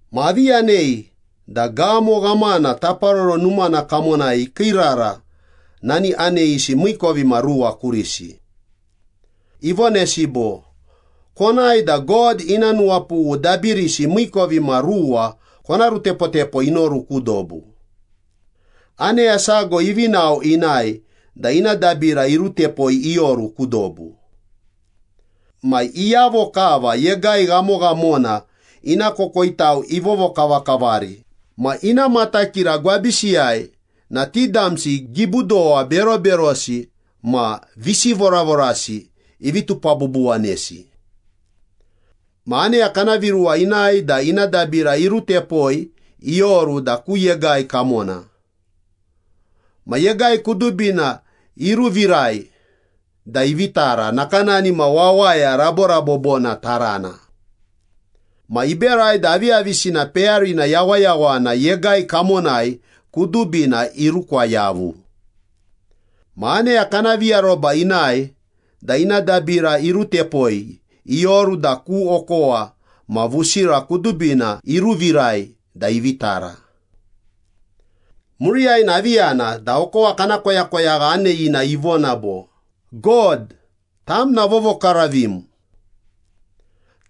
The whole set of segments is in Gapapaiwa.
Ma avi yanei da gamo ghamana taparoro numana kamonai ikiirara nani aneyisi miikovimaruwa kurisi. Ivonesi bo, “Konae da God ina nuwapughu dabirisi miikovimaruwa kona rutepotepo inoru ku dobu.” Aneya sago ivi nao inae da ina dabira irutepoi ioru ku dobu. Ma iyavo kava yegai ghamoghamona ina kokoitau ivovokavakavari ma ina matakira gwabisiyai na ti damsi gibudowa beroberosi ma visivoravorasi ivi tupabubuwanesi. Ma aneya kana viruwa inae da ina dabira irutepoi ioru da ku yegai kamona. Ma yegai kudubina iruvirai da ivi tara nakanani ma wawaya raborabobona tarana. Ma iberai da aviyavisina peyarina yawayawana yegai kamonai kudubina irukwa yavui. Ma aneya kana viaroba inae da ina dabira irutepoi ioru da ku okowa ma vusira kudubina iruvirai da ivi tara. Muriyai na avi yana da okowa kana koyakoyagha aneyina ivona bo, “God, tam na vovokaravim.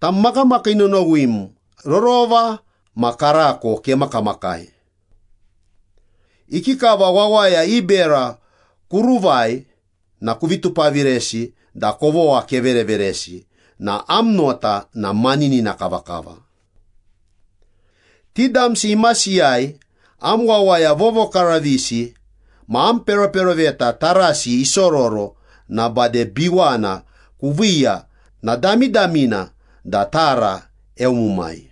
Tam makamakii nonowim, rorova ma karako kemakamakai. Ikikava wawaya i bera kuruvai ma kuvi tupaviresi da kovogha kevereveresi na am nota na maninina kavakava. Ti damsi imasiyai am wawaya vovokaravisi ma am peroperoveta tarasi isororo na bade biwana kuviiya na damidamina da tara eumumai.”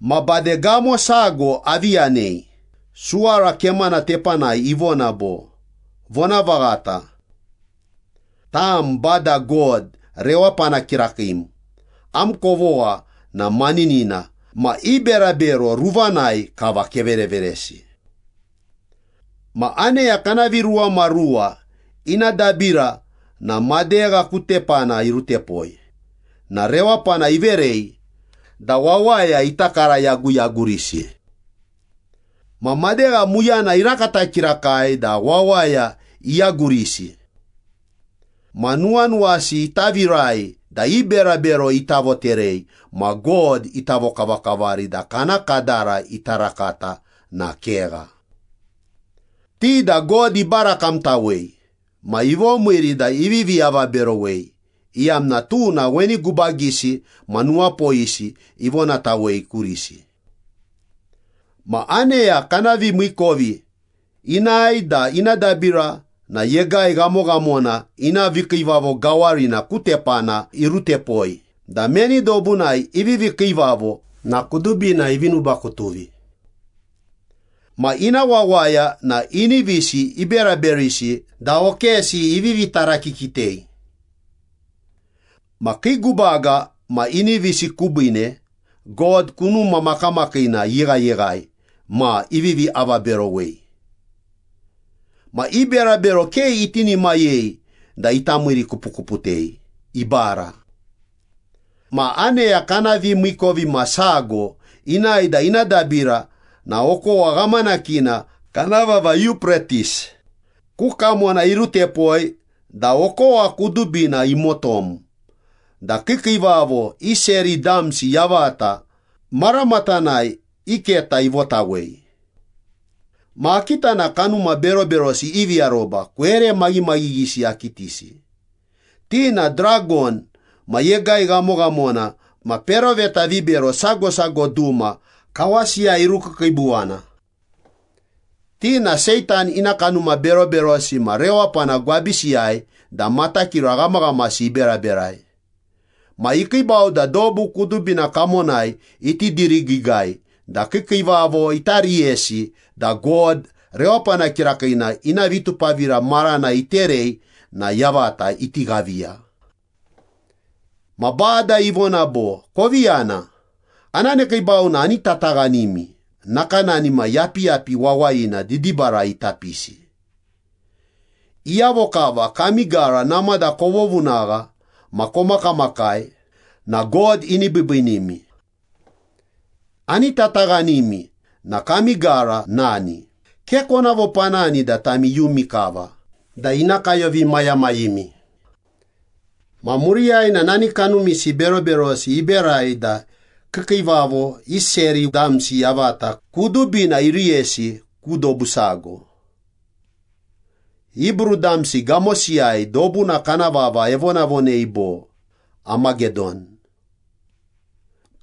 Ma bade gamo sago avi yanei, suwara kemana tepanai ivona bo, “Vonavaghata. Tam Bada God rewapana kirakiim, am kovogha na maninina ma i berabero ruvanai kava kevereveresi.” Ma aneya kana viruwamaruwa ina dabira na madegha ku tepana irutepoi na rewapana iverei da wawaya ita karayaguyagurisi. Ma madegha muyana irakata kirakai da wawaya iyagurisi. Ma nuwanuwasi ita virai da i berabero ita voterei ma God ita vokavakavari da kana kadara ita rakata na kegha. Ti da God ibarakamtawei ma ivomiiri da ivivi avaberowei, iyamna tuna weni gubagisi ma nuwapoyisi ivonatawei kurisi. Ma aneya kana vimiikovi inae da ina dabira na yegai ghamoghamona ina vikiivavo gawarina ku tepana irutepoi da meni dobunai ivivi kiivavo na kudubina ivi nubakutuvi. Ma ina wawaya na inivisi iberaberisi da okesi ivivi tarakikitei. Ma kii gubaga ma inivisi kubiine God kunuma makamakiina iyeghayeghai ma ivivi avaberowei. Ma i berabero ke itinimayei da ita miirikupukuputei, ibara. Ma aneya kana vimiikovimasago inae da ina dabira na okowa ghamanakina kana vava Yupretis ku kamona irutepoi da okowa kudubina imotom da kiikiivavo i seri damsi yavata maramatanai i keta ivotawei. Ma akita na kanuma beroberosi ivi aroba kwere maghimaghighisi akitisi. Ti na dragon ma yegai ghamoghamona ma peroveta vibero sago sago duma kawasiyai irukiikiibuwana. Ti na Seitan ina kanuma beroberosi ma rewapana gwabisiyai da matakira ghamaghamasi iberaberai. Ma ikiibau da dobu kudubina kamonai iti dirigiigai da kiikiivavo ita riyesi da God rewapana kirakiina ina vitupavira marana iterei na yavata iti ghaviya. Ma Bada ivona bo, “Kovi yana, ana nekiibau na ani tataghanimi nakanani ma yapiyapi wawayina didibarai ita pisi. Iyavo kava kami gara namada kovovunagha ma komakamakai na God ini biibiinimi. Ani tataghanimi na kami gara nani, ke kona vopanani da tami iyumi kava da ina kayovimayamayimi.” Ma muriyai na nani kanumisi beroberosi iberai da kiikiivavo i seri damsi yavata kudubina iriyesi ku dobu sago. Hibru damsi gamosiyai dobuna kana vava evonavonei bo, Amagedon.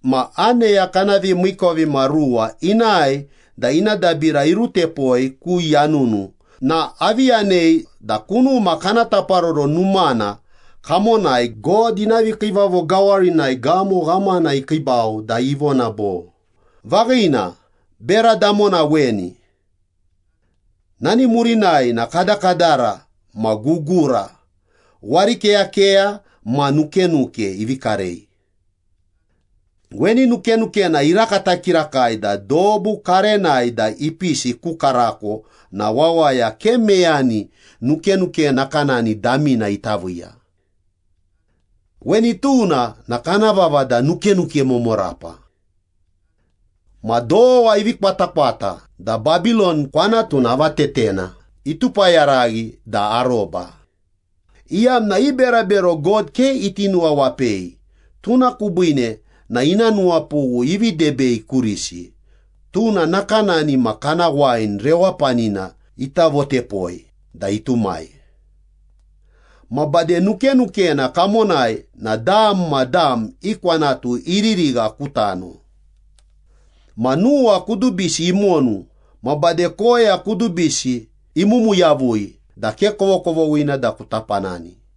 Ma aneya kana vimiikovimaruwa inae da ina dabira irutepoi ku yanunu na avi yanei da kunuma kana taparoro numana kamonai, God ina vikiivavo gawarinai gamo ghamana ikiibau da ivona bo, “Vaghina, bera damona weni.” Nani murinai na kadakadara ma gugura, warikeyakeya ma nukenuke ivi karei. Weni nukenukena irakata kirakai da dobu karenai da ipisi ku karako na wawaya ke meyani nukenuke nakanani damina ita viiya. Weni tuna na kana vava da nukenuke momorapa. Ma dowa ivi kwatakwata da Babilon kwanatuna avatetena itupayaraghi da aroba, iyamna i berabero God ke iti nuwawapei tuna kubiine na ina nuwapughu ivi debei kurisi, tuna nakanani ma kana wain rewapanina ita votepoi da itumai. Ma bade nukenukena kamonai na dam ma dam i kwanatu iririgha ku tano. Ma nuwa kudubisi imonu ma bade koya kudubisi imumu yavui da ke kovokovoghina da kuta panani.